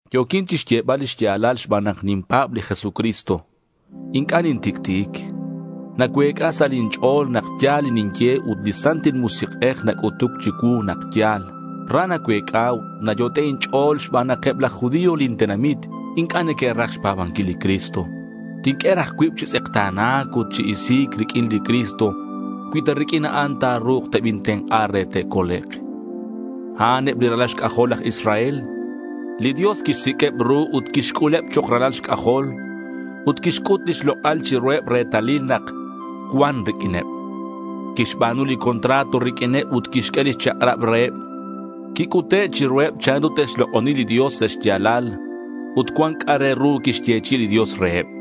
Yo̱quin chixyebal li xya̱lal xban nak ninpa̱b li Jesucristo. Inc'a' nintic'ti'ic. Nacuec'a sa' lin ch'o̱l nak ya̱l li ninye ut li Santil Musik'ej nac'utuc chicuu nak ya̱l. Ra nacuec'a ut nayot'e' inch'o̱l xban nak eb laj judío lin tenamit inc'a' neque'raj xpa̱banquil li Cristo. Tinq'ue raj cuib chi tz'ekta̱na̱c ut chi isi̱c riq'uin li Cristo cui ta riq'uin a'an ta̱ru̱k tebintenk'a re te'colek'. A'an eb li ralal xc'ajol laj Israel. Li Dios quixsiq'ueb ru ut quixc'uleb chok' ralal xc'ajol, ut quixc'ut lix lok'al chiruheb retalil nak cuan riq'uineb. Quixba̱nu li contrato riq'uineb ut quixq'ue lix chak'rab reheb. Quic'ute' chiruheb chanru te'xlok'oni li Dios sa' xya̱lal ut cuan c'a' re ru quixyechi'i li Dios reheb.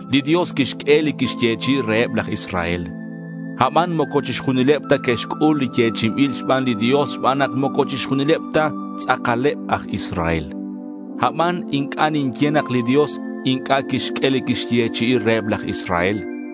Li Dios quixq'ue li quixyechi'i reheb laj Israel. Aban moco chixjunileb ta que'xc'ul li yechi'inbil xban li Dios xban nak moco chixjunileb ta tz'akaleb aj Israel. Aban inc'a' ninye nak li Dios inc'a' quixq'ue li quixyechi'i reheb laj Israel.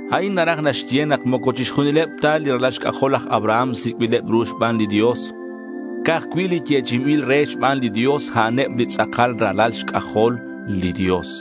A'in naraj naxye nak moco chixjunileb ta li ralal xc'ajol laj Abraham sic'bileb ru xban li Dios. Ca'aj cui' li yechi'inbil re xban li Dios, a'aneb li tz'akal ralal xc'ajol li Dios.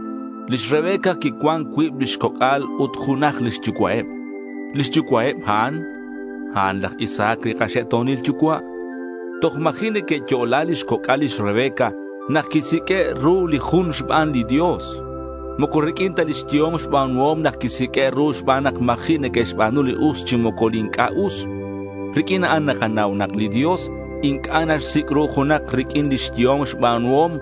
Lix Rebeca quicuan cuib lix coc'al ut junaj lix yucua'eb. Lix yucua'eb a'an, a'an laj Isaac li kaxe'to̱nil yucua'. Toj ma̱ji' neque'yo'la lix coc'al lix Rebeca nak quisiq'ue' ru li jun xban li Dios. Moco riq'uin ta lix yehom xba̱nuhom nak quisiq'ue' ru xban nak ma̱ji' neque'xba̱nu li us chi moco li inc'a' us. Riq'uin a'an nakanau nak li Dios inc'a' naxsic' ru junak riq'uin lix yehom xba̱nuhom.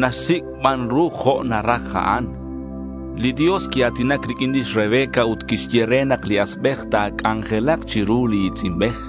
Naxsic' ban ru jo' naraj a'an. Li Dios quia̱tinac riq'uin lix Rebeca ut quixye re nak li asbej ta̱c'anjelak chiru li i̱tz'inbej.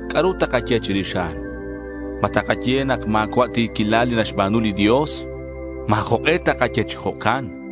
¿C'a'ru takaye chirix a'an? ¿Ma takaye nak ma̱cua' ti̱quilal li naxba̱nu li Dios? Ma̱ jok'e takaye chi jo'can.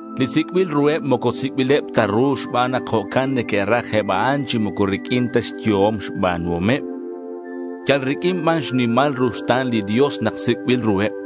Li sic'bil ruheb moco sic'bileb ta ru xban nak jo'can neque'raj eb a'an chi moco riq'uin ta xyehom xba̱nuhomeb. Yal riq'uin ban xnimal ruxta̱n li Dios nak sic'bil ruheb.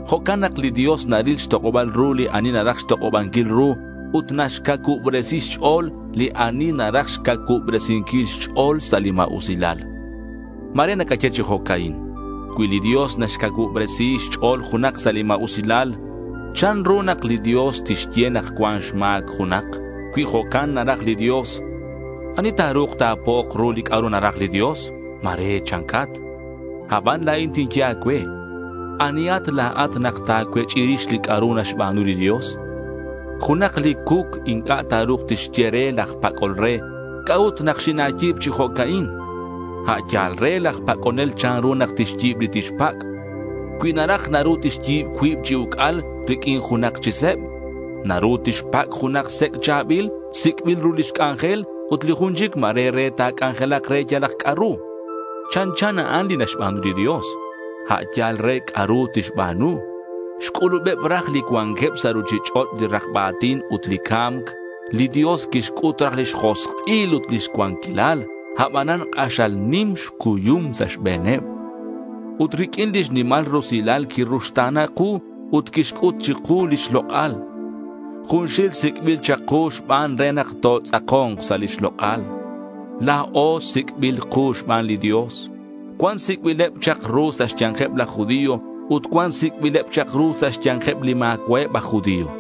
Jo'can nak li Dios naril xtok'oba̱l ru li ani naraj xtok'obanquil ru ut naxcacuubresi xch'o̱l li ani naraj xcacuubresinquil xch'o̱l sa' li ma̱usilal. Ma̱re nacaye chi jo'ca'in, Cui li Dios naxcacuubresi xch'o̱l junak sa' li ma̱usilal, ¿chanru nak li Dios tixye nak cuan xma̱c junak? Cui jo'can naraj li Dios, ¿ani ta̱ru̱k ta̱po'ok ru li c'a'ru naraj li Dios? ma̱re chancat. Aban la̱in tinye a̱cue, ¿anihat la̱at nak ta̱cuech'i rix li c'a'ru naxba̱nu li Dios? Junak li cuc inc'a' ta̱ru̱k tixye re laj pac'ol re, ¿C'a'ut nak xina̱yi̱b chi jo'ca'in? A' yal re laj pac'onel chanru nak tixyi̱b li tixpac'. Cui naraj naru tixyi̱b cuib chi uc'al riq'uin junaj chi seb. Naru tixpac' junak sec' cha̱bil, sic'bil ru lix c'anjel, ut li jun chic ma̱re re ta̱c'anjelak re yalak c'a'ru. Chanchan a'an li naxba̱nu li Dios. A'an yal re c'a'ru tixba̱nu. Xc'ulubeb raj li cuanqueb sa' ruchich'och' li rakba a̱tin ut li ca̱mc. Li Dios quixc'ut raj lix josk'il ut lix cuanquilal. Abanan k'axal nim xcuyum sa' xbe̱neb. Ut riq'uin lix nimal rusilal quiruxta̱na ku ut quixc'ut chiku lix lok'al. Junxil sic'bil chak ku xban re nak totz'ako̱nk sa' lix lok'al. La̱o sic'bil ku xban li Dios. Cuan sic'bileb chak ru sa' xya̱nkeb laj judío ut cuan sic'bileb chak ru sa' xya̱nkeb li ma̱cua'eb aj judío.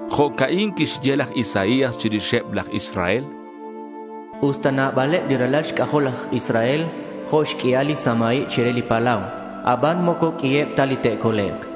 Jo'ca'in quixye laj Isaías chirixeb laj Israel: Usta nabaleb li ralal xc'ajol laj Israel jo' xq'uial li samaib chire li palau, aban moco q'uiheb ta li te'colek'.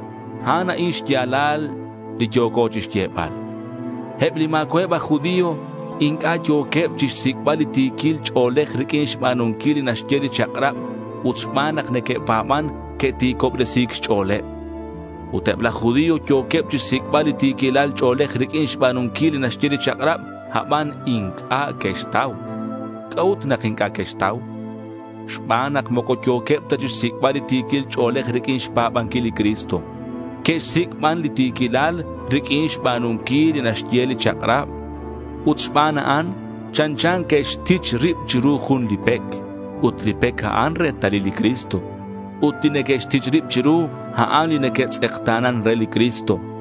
A'an a'in xya̱lal li yo̱co chixyebal: Eb li ma̱cua'eb aj judío inc'a' yo̱queb chixsic'bal li ti̱quil ch'o̱lej riq'uin xba̱nunquil li naxye li chak'rab, ut xban nak que'pa̱ban, que'ti̱cobresi̱c xch'o̱leb. Ut eb laj judío yo̱queb chixsic'bal li ti̱quil ch'o̱lej riq'uin xba̱nunquil li naxye li chak'rab, aban inc'a' que'xtau. ¿C'a'ut nak inc'a' que'xtau? Xban nak moco yo̱queb ta chixsic'bal li ti̱quil ch'o̱lej riq'uin xpa̱banquil li Cristo. Que'xsic' ban li ti̱quilal riq'uin xba̱nunquil li naxye li chak'rab. Ut xban a'an, chanchan que'xtich rib chiru jun li pec. Ut li pec a'an retalil li Cristo. Ut li neque'xtich rib chiru, a'an li neque'tz'ekta̱nan re li Cristo.